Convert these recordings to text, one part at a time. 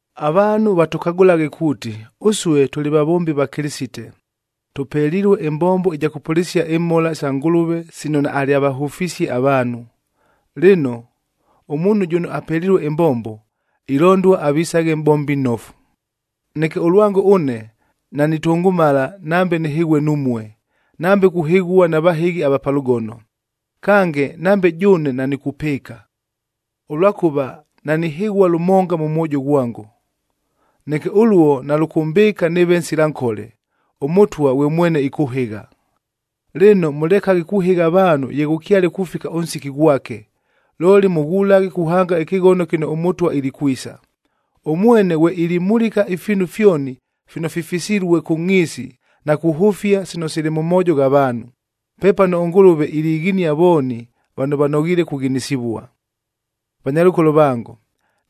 Avaanhu vatʉkagʉlaghe kuuti, ʉsue tʉlɨ vavombi va Kɨlɨsite, tʉpelilue ɨmbombo ɨja kʉpʉlɨsia imhola sa Ngʉlʉve sino naalyavahʉfisie avaanhu. Lɨno, ʉmuunhu jʉno apelilue ɨmbombo, ilondua avisaghe mʼbombi nnofu. Neke ʉlwango ʉne, nanitʉngʉmala nambe nɨhɨghue numue, nambe kuhɨghua na vahɨghi ava pa lʉgono. Kange, nambe jʉʉne nanikupɨɨka, ʉlwakʉva nanihɨghua lʉmonga mʉ mwojo ghwango. Neke ʉluo nalʉkʉmbɨɨka nɨɨve nsila nkole, ʉMʉtwa ghwe mwene ɨkʉhɨgha. Lɨno, mʉlekaghe kuhɨgha avaanhu ye ghʉkyale kufika ʉnsiki ghwake, looli mʉghulaghe kuhanga ɨkɨghono kɨno ʉMʉtwa ilikwisa. Ʉmwene ghwe ilimulika ifiinu fyoni fino fifisilue kʉ ngʼhiisi na kuhʉfia sino sili mʉ moojo gha vaanhu. Pepano ʉNgʉlʉve ilighinia vooni vano vanoghiile kughinisivua. Vanyalʉkolo vango,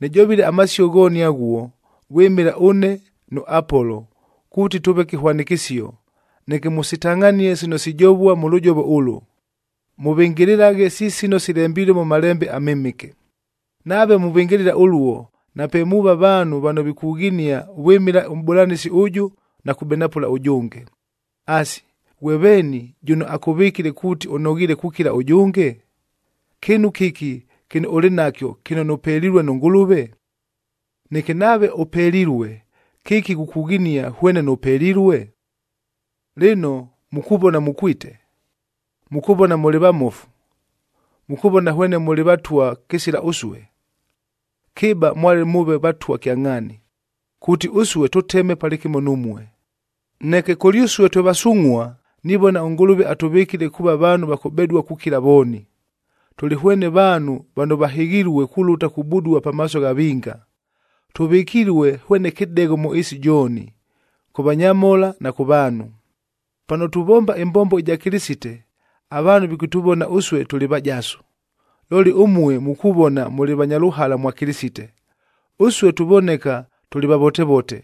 nɨjovile amasio ghooni aghuo, vwɨmɨla ʉne nʉ Apolo kuuti tʉʉve kɨhwanɨkɨsio, neke mʉsitangʼhanie sino sijovua mʉ lʉjovo ʉlʉ, “Mʉvɨngɨlɨlaghe si sino silembilue mʉ Malembe aMɨmɨke.” Nave muvɨngɨlɨla ʉluo, nape muuva vaanhu vano vikughinia vwɨmɨla ʉmʼbʉlanɨsi ʉjʉ na kubenapʉla ʉjʉnge. Asi, ghwe veeni, jʉno akʉvɨkile kuuti ʉnoghiile kukila ʉjʉnge? Kɨɨnu kɨki kɨno ʉlɨ nakyo kɨno nʉpelilue nʉ Ngʉlʉve? Neke nave ʉpelilue, kɨki ghukughinia hwene nʉpelilue? Lɨno mukuvona mukwite! Mukuvona mʉlɨ vamofu! Mukuvona hwene mʉlɨ vatwa kɨsila ʉsue! Kɨba mwale mʉʉve vatwa kyangʼhaani, kuuti ʉsue tʉteme palɨkɨmo numue! Neke kʉlyʉsue twe vasungʼhua,a nivona ʉNgʉlʉve atʉvɨkile kuuva vaanhu va kʉbedua kukila vooni. Tʉlɨ hwene vaanhu vano vahɨghilue kulʉta kubudua pamaaso gha vinga. Tʉvɨkilue hwene kɨdegho mʉ ɨɨsi jooni, kʉ vanyamhola na kʉ vaanhu. Pano tuvomba ɨmbombo ɨja Kɨlɨsite, avaanhu vikʉtʉvona ʉsue tʉlɨ vajasu, looli ʉmue mukuvona mʉlɨ vanya lʉhala mwa Kɨlɨsite. Ʉsue tuvoneka tʉlɨ vavotevote,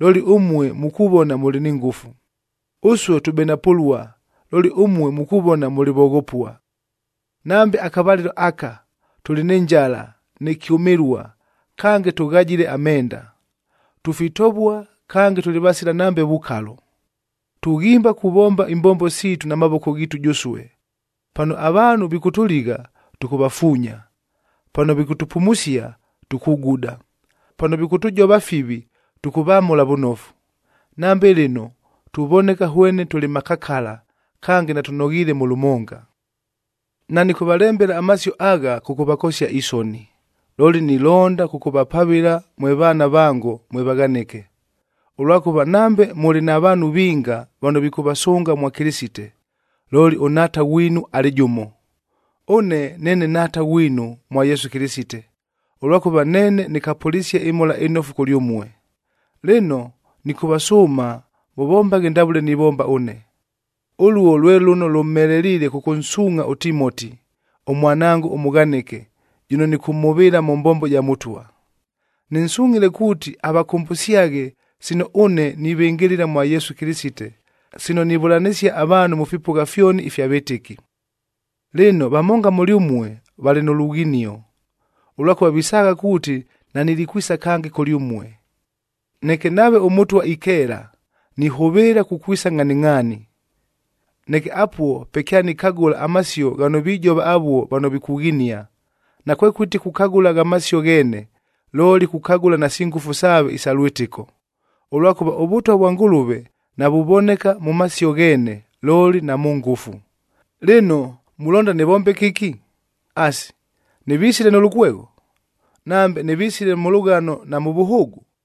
looli ʉmue mukuvona mʉlɨ ni ngʉfu. Ʉsue tubenapʉlua, looli ʉmue mukuvona mʉlɨ voghopua. Nambe akavalɨlo aka, tʉlɨ nɨ njala nɨ kyʉmɨlua, kange tʉghajile amenda. Tufitovua kange tʉlɨ vasila nambe vukalo. Tughimba kuvomba imbombo siitu na mavoko ghiitu jʉsue. Pano avaanhu vikʉtʉligha, tʉkʉvafuunya; pano vikʉtʉpumusia, tukuguda; pano vikʉtʉjova fivi, tʉkʉvamʉla vʉnofu. Nambe lɨno, tuvoneka hwene tʉlɨ makakala, kange natʉnoghiile mʉ lʉmonga. Nanɨkʉvalembela amasio agha kʉvakosia isoni, looli nilonda kʉkʉvapavɨla mwe vaana vango mwe vaghanɨke. Ʉlwakʉva nambe mʉlɨ na vaanhu vinga vano vikʉvasʉnga mwa Kɨlɨsite, looli ʉnhaata ghwinu alɨ jʉmo. Ʉne neene nhaata ghwinu mwa Yesu Kɨlɨsite, ʉlwakʉva neene nɨkapʉlisie ɨMhola ɨNofu kʉlyʉmue. Lɨno, nɨkʉvasʉʉma mʉvombaghe ndavʉle nivomba ʉne. Ʉluo lwe lʉno lʉmheleliile kʉkʉnsuungʼha ʉTimoti, ʉmwanango ʉmʉghanɨke, jʉno nɨkʉmhʉvɨɨla mʉ mbombo ja Mʉtwa. Nɨnsungʼhile kuuti avakʉmbʉsyaghe sino ʉne nivɨngɨlɨla mwa Yesu Kɨlɨsite, sino nivʉlanɨsia avaanhu mʉ fipʉgha fyoni ifya vɨtɨki. Lɨno, vamonga mʉlyʉmue valɨ nʉ lughinio, ʉlwakʉva visaagha kuuti nanilikwisa kange kʉlyʉmue. Neke nave ʉMʉtwa ikeela, nihʉvɨɨla kukwisa ngʼhaningʼhaani. Neke apuo pe kyanikagʉla amasio ghano vijova avuo vano vikughinia, nakwekʉti kukagʉla gha masio gheene, looli kukagʉla nasi ngʉfu saave isa lwɨtɨko. Ʉlwakʉva ʉVʉtwa vwa Ngʉlʉve, navuvoneka mʉ masio gheene, looli na mʉ ngʉfu. Lɨno, mulonda nɨvombe kɨki? Asi, nɨvisile nʉ lʉkwegho? Nambe nɨvisile mʉ lʉghano na mʉ vʉhʉʉgʉ?